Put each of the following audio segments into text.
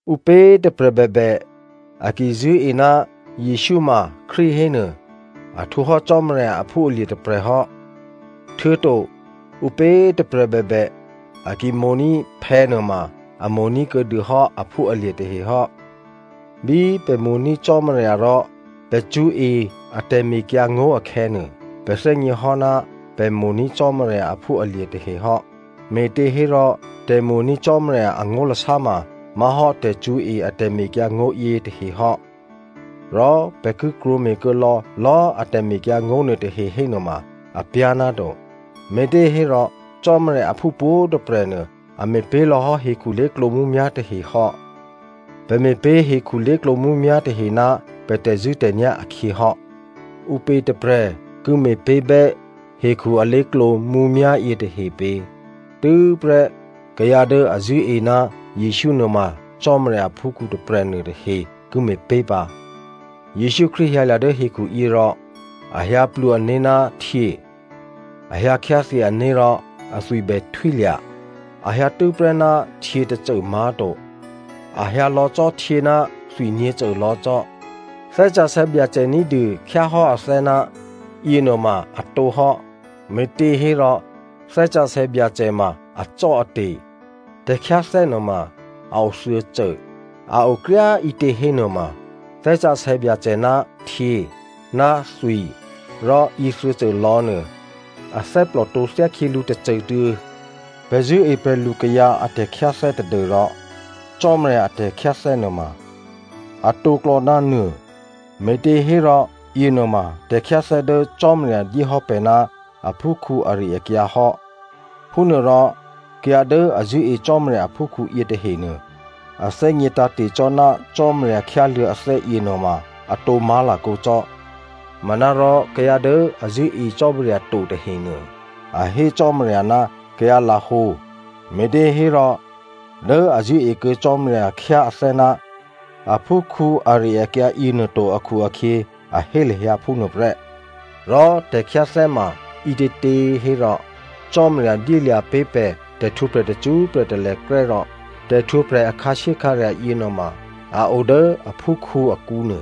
Ǔpě꤮ tôprè̤ bèbè a ki zṳ̂́e ná Jesǔ ma Krístu hénuô, a htwǒhò́ Cò́marya aphúalye̤ tôprè̤hò́, htuô̌to ǔpě꤮ tôprè̤ bèbè a ki mo̤ní̤ phè̌ nuôma, a mo̤ní̤ kuô̌dûhò́ aphúalye̤ tahe hò́. Bí pè̤ mo̤ní̤ Cò́marya rò pè̤ cṳ̌e a tè̤mekyǎngó̤ akhè̌nuô, pè̤ thè́gněhò́ ná pè̤ mo̤ní̤ Cò́marya aphúalye̤ tahe hò́. Me̤těhérò tè̤mo̤ní̤ Cò́marya angó̤lasá ma má̤hò́ tè̤cṳ̌e a tè̤mekyǎngó̤ yětahe hò́. Rò pè̤ ki krwǒme̤ kuô̌ lò̌lò̌꤮ a tè̤mekyǎngó̤ nuôtahe hénuôma apyá̤ náto. Me̤těhérò Cò́marya aphú pwǒ̤꤮ tôprè̤ nuô a me̤pé̤ lò̌ hò́ hekhu lé̤klǒ mǔmyá̤ tahehò́. Pè̤ me̤pé̤ hekhu lé̤klǒ mǔmyá̤ tahe ná pè̤ tè̤zṳ̂́tè̤nyá̤ akhyě hò́. Ǔpě tôprè̤ ki me̤pé̤bè́ hekhu alé̤klǒ mǔmyá̤ yětahe pě? Tû́prè́ kayǎ dố a zṳ̂́e ná Jesǔ nuôma Cò́marya aphúkhǔ tôprè̤ nuôtahe ki me̤pé̤ pǎ. Jesǔ Krístu hyǎlya̤ dố hekhuyě rò a hyǎplwǒ ané̤ ná htyě, a hyǎ khyáthyě ané̤ rò athwi bèhtwílya̤. A hyǎ tû́prè́ ná htyě tôcô má̤to. A hyǎ lò̌ cò́ htyě ná thwi nyě̤cô lò̌ cò́. Thè́ Sǎsè̌ Byacè ní̤dû khyáhò́ athè́ ná yěnuôma a tǒhò́, me̤těhérò Thè́ Sǎsè̌ Byacè ma acò́ate̤. Tè̤khyáthè́ nuôma a o thuô̌cô. A o kryá꤮ ǐtě hénuôma Thè́ Sǎsè̌ Byacè ná htyě ná thwi rò yěthuô̌cô lò̌nuô a thè́plòtǒ thyákhyělǔ tôcôtuô̌. Pè̤ zṳ̂́e prè̤lukayǎ a tè̤khyáthè́ tadû́rò Cò́marya a tè̤khyáthè́ nuôma a tǒklò̌ ná nuô, me̤těhérò yěnuôma tè̤khyáthè́ dố Cò́marya dyéhò́ pè̤ ná aphúkhǔ ari-akyǎ hò́. Phúnuôrò kayǎ dố a zṳ̂́e Cò́marya aphúkhǔ yětahenuô a thè́gně tǎ̤te̤ cò́ ná Cò́marya khyáluô̌ athè́ yěnuôma atǒ má̤lakǒ cò́. Manárò kayǎ dố a zṳ̂́e Cò́marya to tahenuô, a hé Cò́marya ná kayǎ lahǒ, me̤těhérò dố a zṳ̂́e kuô̌ Cò́marya khyá athè́ ná aphúkhǔ ari-akyǎ yěnuô to akhu-akhyě, a hé lahyǎ phúnuô prè́. Rò tè̤khyáthè́ ma ǐtětě hérò, Cò́marya dyélya̤ pé̤ pè̤ tè̤htwǒprè̤ tacṳ́prè̤ talèkrè́ rò tè̤htwǒprè̤ a khǎshyékhǎrya̤ yěnuôma a o dố aphúkhǔ akǔ nuô.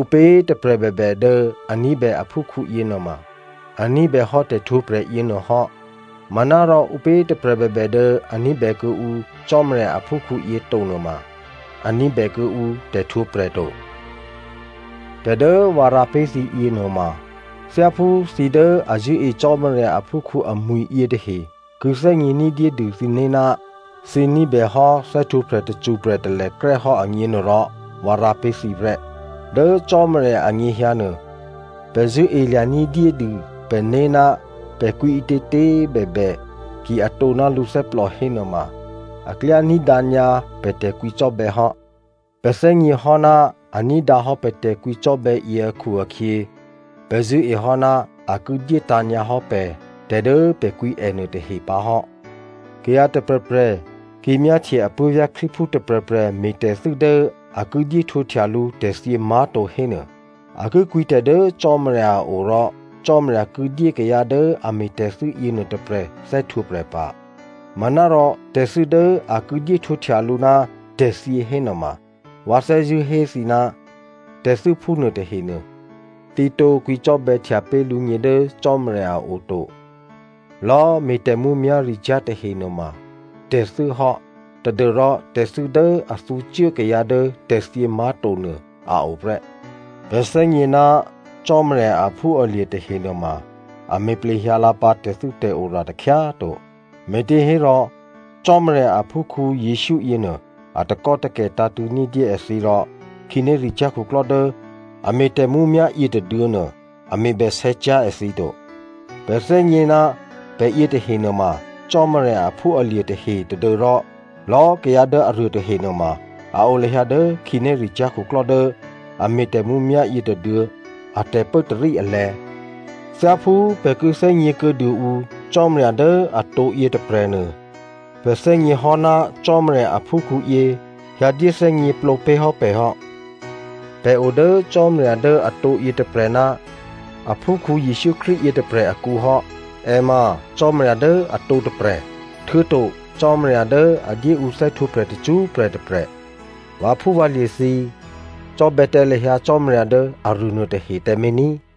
Ǔpě꤮ tôprè̤ bèbè dố a ní̤bè aphúkhǔ yěnuôma, a ní̤bèhò́ tè̤htwǒprè̤ yěnuô hò́. Manárò ǔpě꤮ tôprè̤ bèbè dố a ní̤bè kuô̌ǔ Cò́marya aphúkhǔyě to nuôma, a ní̤bè kuô̌ǔ tè̤htwǒprè̤ to. Tè̤ dố vǎ rǎ pé̤ thǐ yěnuôma, thyáphú thǐ dố a zṳ̂́e Cò́marya aphúkhǔ amwi̤ yětahe ki thè́gně ní̤dyédû thǐné̤ ná thǐ ní̤bèhò́ thè́htwǒprè̤ tacṳ́prè̤ talèkrè́ hò́ agněnuôrò, vǎ rǎ pé̤ thǐ prè́. Dố Cò́marya anyěhyǎ nuô, pè̤ zṳ̂́elya̤ní̤ dyédû pè̤né̤ ná pè̤ kwǐ ǐtětě꤮ bèbè, ki atǒ ná lǔthè́plò hénuôma, a klyá ní̤dǎ nyǎ pè̤ tè̤kwǐcò́bè̌ hò́. Pè̤ thè́gněhò́ ná a ní̤dǎ hò́ pè̤ tè̤kwǐcò́bè̌ yě akhu-akhyě, pè̤ zṳ̂́ehò́ ná a ki dyétǎ̤ nyǎ hò́ pè̤ tè̤ dố pè̤ kwǐ è nuôtahe pǎ hò́. Kayǎ tôprè̤prè̤ ki myáhtye apuố̤vyá̤ Krístuphú tôprè̤prè̤ me̤tè̤thû́ dố a ki dyé htwǒhtya lǔ tè̤thyě má̤to hénuô, a ki kwǐtè̤ dố Cò́marya a o rò Cò́marya ki dyé kayǎ dố a me̤tè̤thû́ yěnuô tôprè̤ thè́htwǒprè̤ pǎ. Manárò tè̤thû́ dố a ki dyé htwǒhtya lǔ ná tè̤thyě hénuôma, vǎ thè́zṳ̂́ hé thǐ ná tè̤thû́ phúnuô tahenuô thǐ tǒ kwǐcò́bè̌htya pé̤ lǔgně dố Cò́marya a o to. Lò̌꤮ me̤ tè̤mǔmyá̤ricyá̤ tahe nuôma tè̤thû́ hò́ tadû́rò tè̤thû́ dố a thǔcuố kayǎ dố tè̤thyě má̤to nuô a o prè́. Pè̤ thè́gně ná Cò́marya aphúalye̤ tahe nuôma, a me̤ plehyǎlǎ pǎ tè̤thû́tè̤ora takhyá꤮ to. Me̤těhérò Cò́marya aphúkhǔ Jesǔ yěnuô a takò́takè̤ tǎ̤tṳ̂̌ ní̤dyé èthǐ rò khǐnéricyá̤ khuklò́ dố a me̤ tè̤mǔmyá̤ yětôduô̌nuô a me̤bèsè̌cyá̤ èthǐ to. Pè̤ thè́gně ná pè̤ yětahe nuôma Cò́marya aphúalye̤ tahe tadû́rò lò̌꤮ kayǎ dố aruô tahe nuôma a o lahyǎ dố khǐnéricyá̤ khuklò́ dố a me̤ tè̤mǔmyá̤ yětôduô̌ a tè̤pốtarí alè̤̌. Thyáphú pè̤ ki thè́gně kuô̌dû ǔ Cò́marya dố atǒ yětôprè̤nuô, pè̤ thè́gněhò́ ná Cò́marya aphúkhǔyě hyǎ dyé thè́gněplǒ pé̤ hò́ pè̤ hò́. Pè̤ o dố Cò́marya dố atǒ yětôprè̤ ná aphúkhǔ Jesǔ Krístu yětôprè̤ akǔ hò́. È ma Cò́marya dố atǒ tôprè̤, htuô̌to Cò́marya dố a dyé ǔ thè́htwǒprè̤ tacṳ́prè̤ tôprè̤. Vǎphúvǎlye̤ thǐ꤮ cò́bè̌ tǎ lahyǎ Cò́marya dố aruô nuôtahe tǎmé̤ ní꤮.